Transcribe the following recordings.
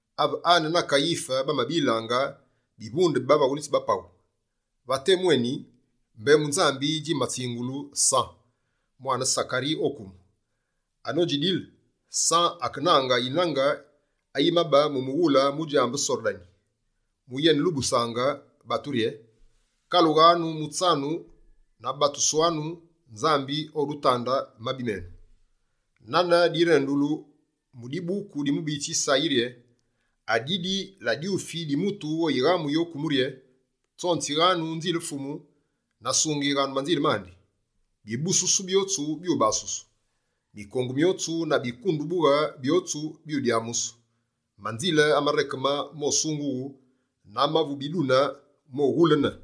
Ave Ane na Kayife bamabilaange bivunde bi bavaghulitsi ba paghu, va temu éni, mbembu Nzambi djimatsingulu San, mwane Sakari o kumu. Anodjidile, San akenange yinange ayimabe mu mughule mudjambe Sordani, mu yenelubusaange batu rye: «Kalughanu mutsanu na batuswanu. Nzambi odutande mabi menu.» Nane direndulu mu dibuku di mubiyitsi Yisayi rye: «Adidi la dyufi di mutu oyighamuyi o kumu rye: Tsonzighanu nzile Fumu na sungighanu manzile mandi. Bibususu byotsu byubasusu. Mikongu myotsu na bikundubughe byotsu byudyamusu. Manzile amarekeme mosungughu, na amavu bidune moghulene.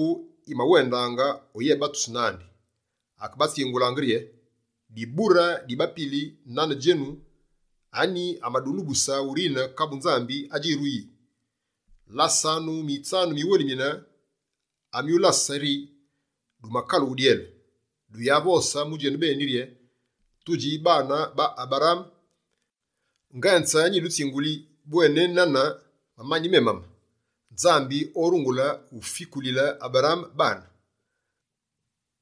Yinombu yimawendaange oyébatusu nandi, akebatsingulaange rye: «Dibure di bapili nane djenu, anyi amadulubuse urine kabu Nzambi adjiruyi? Lasanu mitsanu miwelimine amyulase rye dumakalughe dyele. Duyavose mu djenubeni rye: “Tudji baane ba Aberaame.” Ngenze nyidutsinguli bwena ne na mamani memama, Nzambi orungule ufikulile Aberaame baane.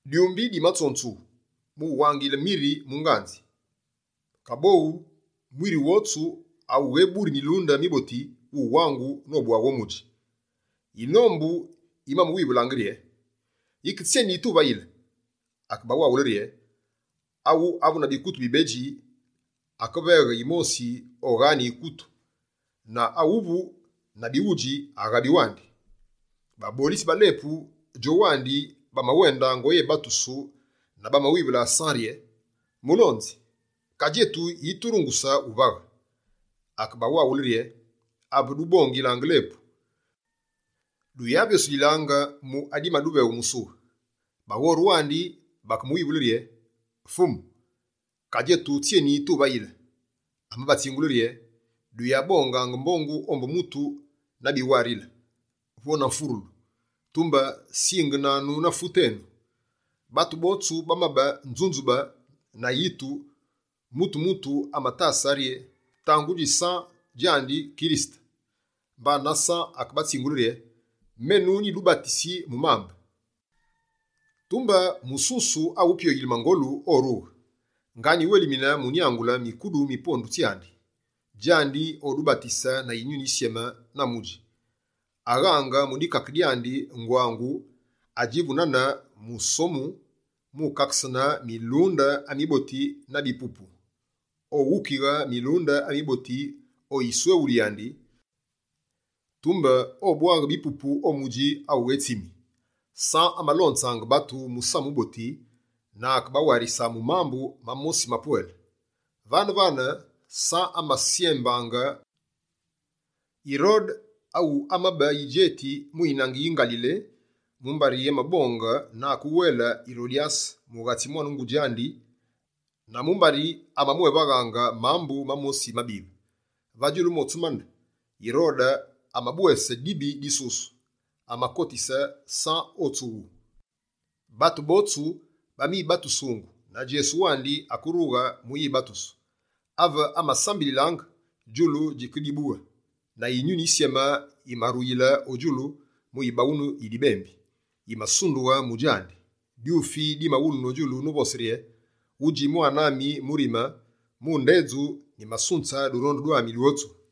Dyumbi dimatsonzughu mu wangile mwiri mu nganzi. Kaboghu mwiri wotsu awugheburi milunde miboti wuwangu nobwaghu o mudji.» Yinombu yimamuwivulaange rye: «Yike tsyéni tuvayile?» Akebawaghule rye: «Awu avu na bikutu bibedji akaveghe yimosi oghaane yikutu, na awu avu na bighudji, aghabi wandi.» Babolitsi ba lepu, djowandi bamawendaange oyebatusu na bamawivule San rye: «Mulonzi, ka djetu yiturunguse wuvaghe?» Akebawaghule rye: «Ave dubongilaange lepu, duyavyosulilaange mu adimaduveghu musughu.» Baghore wandi bakemuwivule rye: «Fumu, ka djetu, tsyé tuvayile?» Amabatsingule rye: «Duyabongaange mbongu ombu mutu na biwarile, vo na mfurulu, tumbe singenanu na fute tsyénu.» Batu botsu bamabe nzunzubaa na yitu! Mutu-mutu amatase rye tangudji San djandi Kirisete. Mbana San akebatsingule rye: «Menu nyidubatisi mu mambe, tumbe mususu awu pyoghulile mangolu orughe. Nga nyiwelimine mu nyangule mikudu mi bapondu bandi. Djandi odubatise na Yinyuni Yisyeme na mudji. Aghange mu dikake dyandi ngwangu adjivu nane musomu mukakesune milunde amiboti na bipupu. Oghukighe milunde amiboti o yisweghulu yandi, tumbe obwaghe bipupu o mudji awu ghetsimi.» San amalonzaange batu Musamu wuboti na akebawarisa mu mambu mamosi mapwele. Vane-vane, San amasyembaange Yirode awu amabe yidjeti mu yinange yi Ngalile mumbari amabonge na akewele Yirodyase mughatsi, mwane ngudji andi na mumbari amamwévaghaange mambu mamosi mabive. Va djulu motsu mane, Yirode amabwese dibi disusu: amakotise San o tsughu. Batu botsu bamibatusungu, na Djesu wandi akerughe mu yibatusu. Ave amasambililaange, djulu djikedibughe. Na Yinyuni Yisyeme yimaruyile o djulu mu yibawunu yi dibembi, yimasundughe mu djandi. Dyufi dimawulunu o djulu novose rye: «Wudji mwane ami murime, mu ndedju, nyimasunze durondu dwami dwotsu.»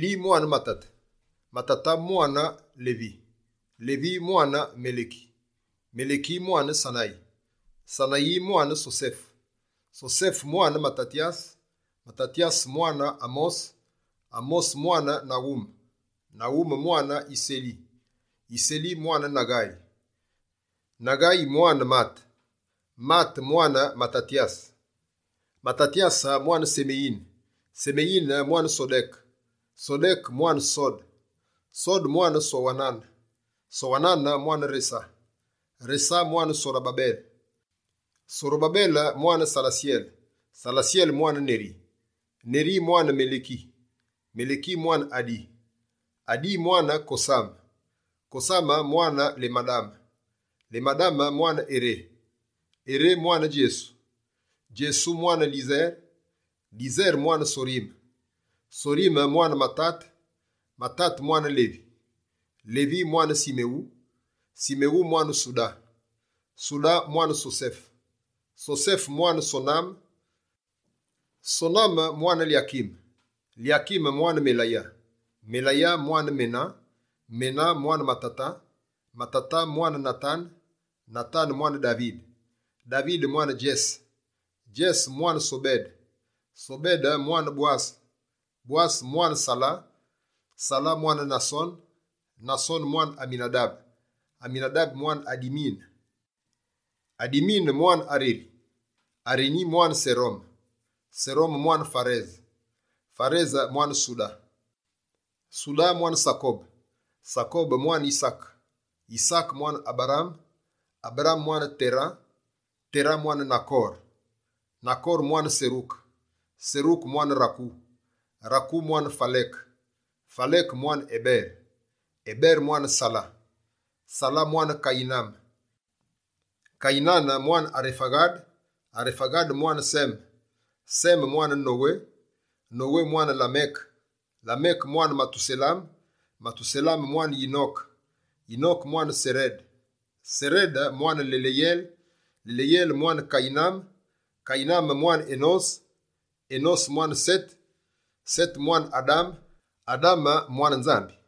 mwane Matate, mwane Levi, mwane Meleki, mwane Sanayi, mwane Sosefe, mwane Matatyase, mwane Amose, mwane Nawume, mwane Yiseli, mwane Naghayi, mwane Mate, mwane Matatyase, mwane Semeyine, mwane Sodeke, mwane Sode, mwane Sowanane, mwane Resa, mwane Sorobabele, mwane Salatyele, mwane Neri, mwane Meleki, mwane Adi, mwane Kosame, mwane Lemadame, mwane Eré, mwane Djesu, mwane Lyesere, mwane Sorime, mwane Matate, mwane Levi, mwane Simewu, mwane Suda, mwane Sosefe, mwane Soname, mwane Lyakime, mwane Meleya, mwane Mena, mwane Matata, mwane Natane, mwane Davide, mwane Djese, mwane Sobede, mwane Bwase, mwane Sala, mwane Nasone, mwane Aminadabe, mwane Adimine, mwane Areni, mwane Serome, mwane Farese, mwane Suda, mwane Sakobe, mwane Yisaake, mwane Aberaame, mwane Tera, mwane Nakore, mwane Seruke, mwane Raku, mwane Faleke, mwane Ebere, mwane Sala, mwane Kayiname, mwane Arefaghade, mwane Seme, mwane Nowe, mwane Lameke, mwane Matuselame, mwane Yinoke, mwane Sarede, mwane Maleleyele, mwane Kayiname, mwane Enose, mwane Sete, mwane Adame mwane Nzambi.